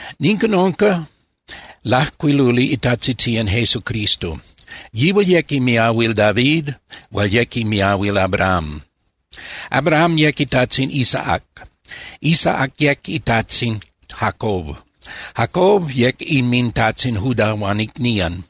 Nican unca lajcuiluli itajtzitzían Jesucristo. Yihual yec imiahuil David hual yec imiahuil Abrahám. Abraham yec itajtzin Isaac, Isaac yec itajtzin Jacob, Jacob yec inmintajtzin Judá huan icnían.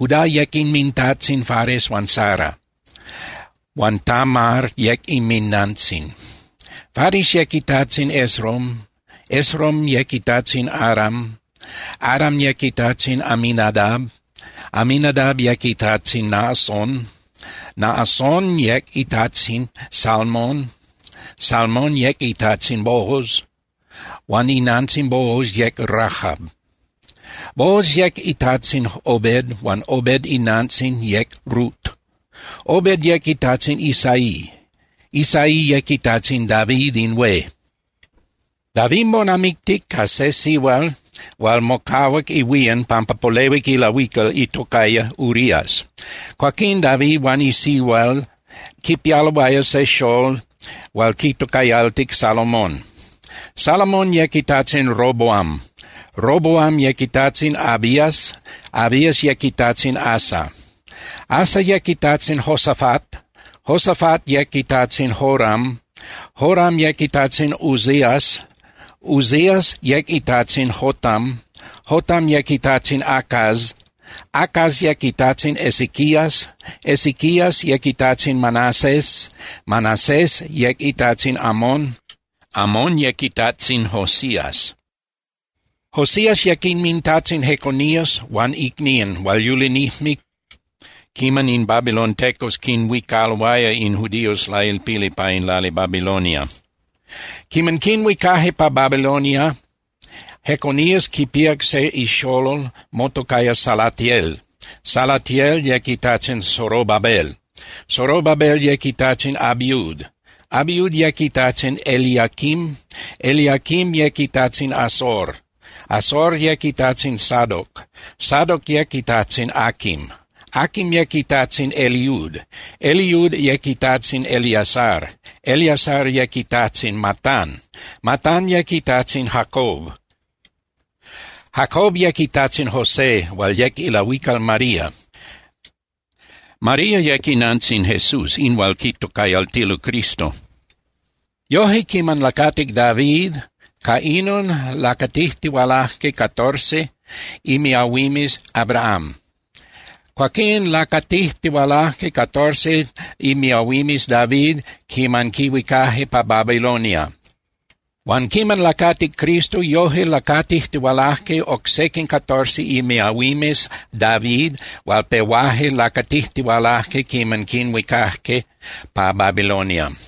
Judá yec inmintajtzin Fares huan Zara, huan Tamar yec inminantzin. Fares yec itajtzin Esrom, Esrom yec itajtzin Aram. Aram yec itajtzin Aminadab, Aminadab yec itajtzin Naasón, Naasón yec itajtzin Salmón. Salmón yec itajtzin Booz, huan inantzin Booz yec Rahab. Booz yec itajtzin Obed huan Obed inantzin yec Rut. Obed yec itajtzin Isaí. Isaí yec itajtzin David in hué. David monamictic ca se sihual hual mocahuac ihuían pampa polehuic ilahuical itocaya Urías. Cuaquinon David huan in sihual quipialoaya se xolol hual quitocayaltic Salomón. Salomón yec itajtzin Roboam, Roboam yec itajtzin Abías, Abías yec itajtzin Asa. Asa yec itajtzin Josafat, Josafat yec itajtzin Joram, Joram yec itajtzin Uzías. Uzías yec itajtzin Jotam, Jotam yec itajtzin Acaz, Acaz yec itajtzin Ezequías. Ezequías yec itajtzin Manasés, Manasés yec itajtzin Amón, Amón yec itajtzin Josías. Josías yec inmintajtzin Jeconías huan icnían hual yulinijme quiman in babilontecos quinhuicaloaya in judíos lailpili pa in lali Babilonia. Quiman quinhuicaje pa Babilonia, Jeconías quipíac se ixolol motocaya Salatiel, Salatiel yec itajtzin Zorobabel. Zorobabel yec itajtzin Abiud, Abiud yec itajtzin Eliaquim, Eliaquim yec itajtzin Azor. Azor yec itajtzin Sadoc, Sadoc yec itajtzin Aquim, Aquim yec itajtzin Eliud. Eliud yec itajtzin Eleazar, Eleazar yec itajtzin Matán, Matán yec itajtzin Jacob. Jacob yec itajtzin José hual yec ilahuical María. María yec inantzin Jesús in hual quitocayaltilo Cristo. Yoje, quiman lacatic David, ca inon lacatijtihualaje catorce imiahuimes Abrahám. Cuaquín lacatijtihualaje catorce imiahuimes David quiman quinhuicaje pa Babilonia. Huan quiman lacatic Cristo yoje lacatijtihualaje oc sequin catorce imiahuimes David hual pehuaje lacatijtihualaje quiman quinhuicaje pa Babilonia.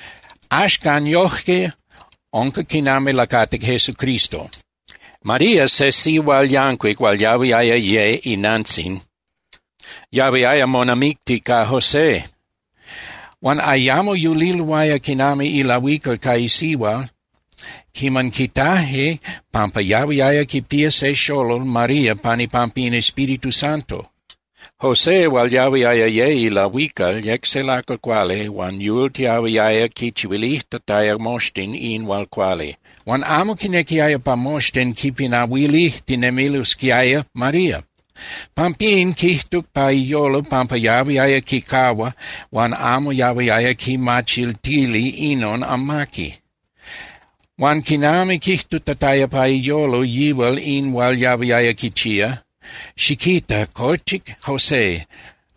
Axcan, yoje unca quinami lacatic Jesucristo. María, se sihual yancuic hual yahuiaya ye inantzin, yahuiaya monamicti ca José. Huan ayamo yuliloaya quinami ilahuical ca isihua quiman quitaje pampa yahuiaya quipía se xolol María pan ipampa in Espíritu Santo. José hual yahuiaya ye ilahuical yec se lacal cuali huan yultiahuiaya quichihuilijtataya moxtin in hual cuali. Huan amo quinequiaya pa moxtin quipinahuilijtinemilosquiaya María. Pampín quijtuc pa iyolo pampa yahuiaya quicahua huan amo yahuiaya quimachiltili inon amaqui. Huan quinami quijtutataya pa iyolo yihual in hual yahuiaya quichía, xiquita, cochic José.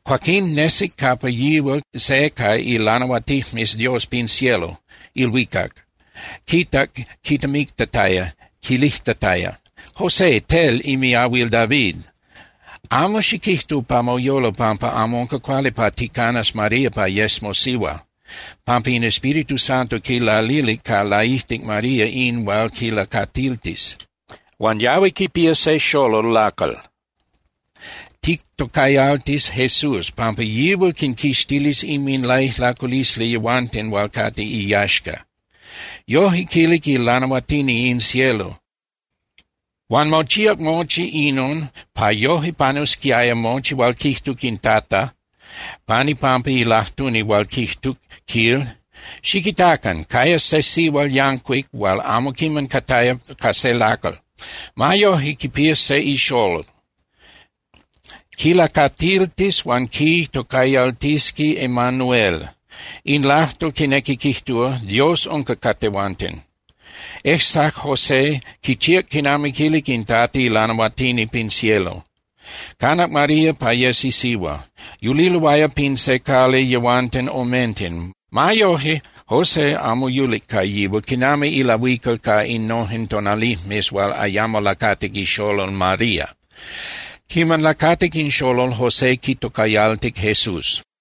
Cuaquín nesic capa yihual se ca ilanahuatinijmes Dios pin cielo (ilhuicac), quitac quitemictataya, quilijtataya: —José, tel imiahuil David, amo xiquijtu pa moyolo pampa amo unca cuali pa ticanas María pa yes mosihua, (pampa in Espíritu Santo quilalilic ca laijtic María in hual quilacatiltis). Huan yahui quipía se xolol lacal. Tictocayaltis Jesús, pampa yihual quinquixtilis inminlaijlaculisli yehuanten hual cate iyaxca. Yoje quilic ilanahuatini in cielo. Huan mochíac mochi inon pa yoje panusquiaya mochi hual quijtuc in Tata pan ipampa ilajtuni hual quijtuc, quil: Xiquitacan. Cayas se sihual yancuic hual amo quiman cataya ca se lacal. Ma yojque, quipías se ixolol. Quilacatiltis huan quitocayaltisqui Emanuel. In lajtol quinequi quijtúa: Dios unca ca tehuanten. Ejsac José, quichíac quinami quilic in Tata ilanahuatini pin cielo. Canac María pa yes isihua. Yuliloaya pin se cali yehuanten omenten. Ma yoje, José amo yulic ca yihual quinami ilahuical pa innojen tonalijmes hual ayamo lacatic ixolol María. Quiman lacatic in xolol, José quitocayaltic Jesús.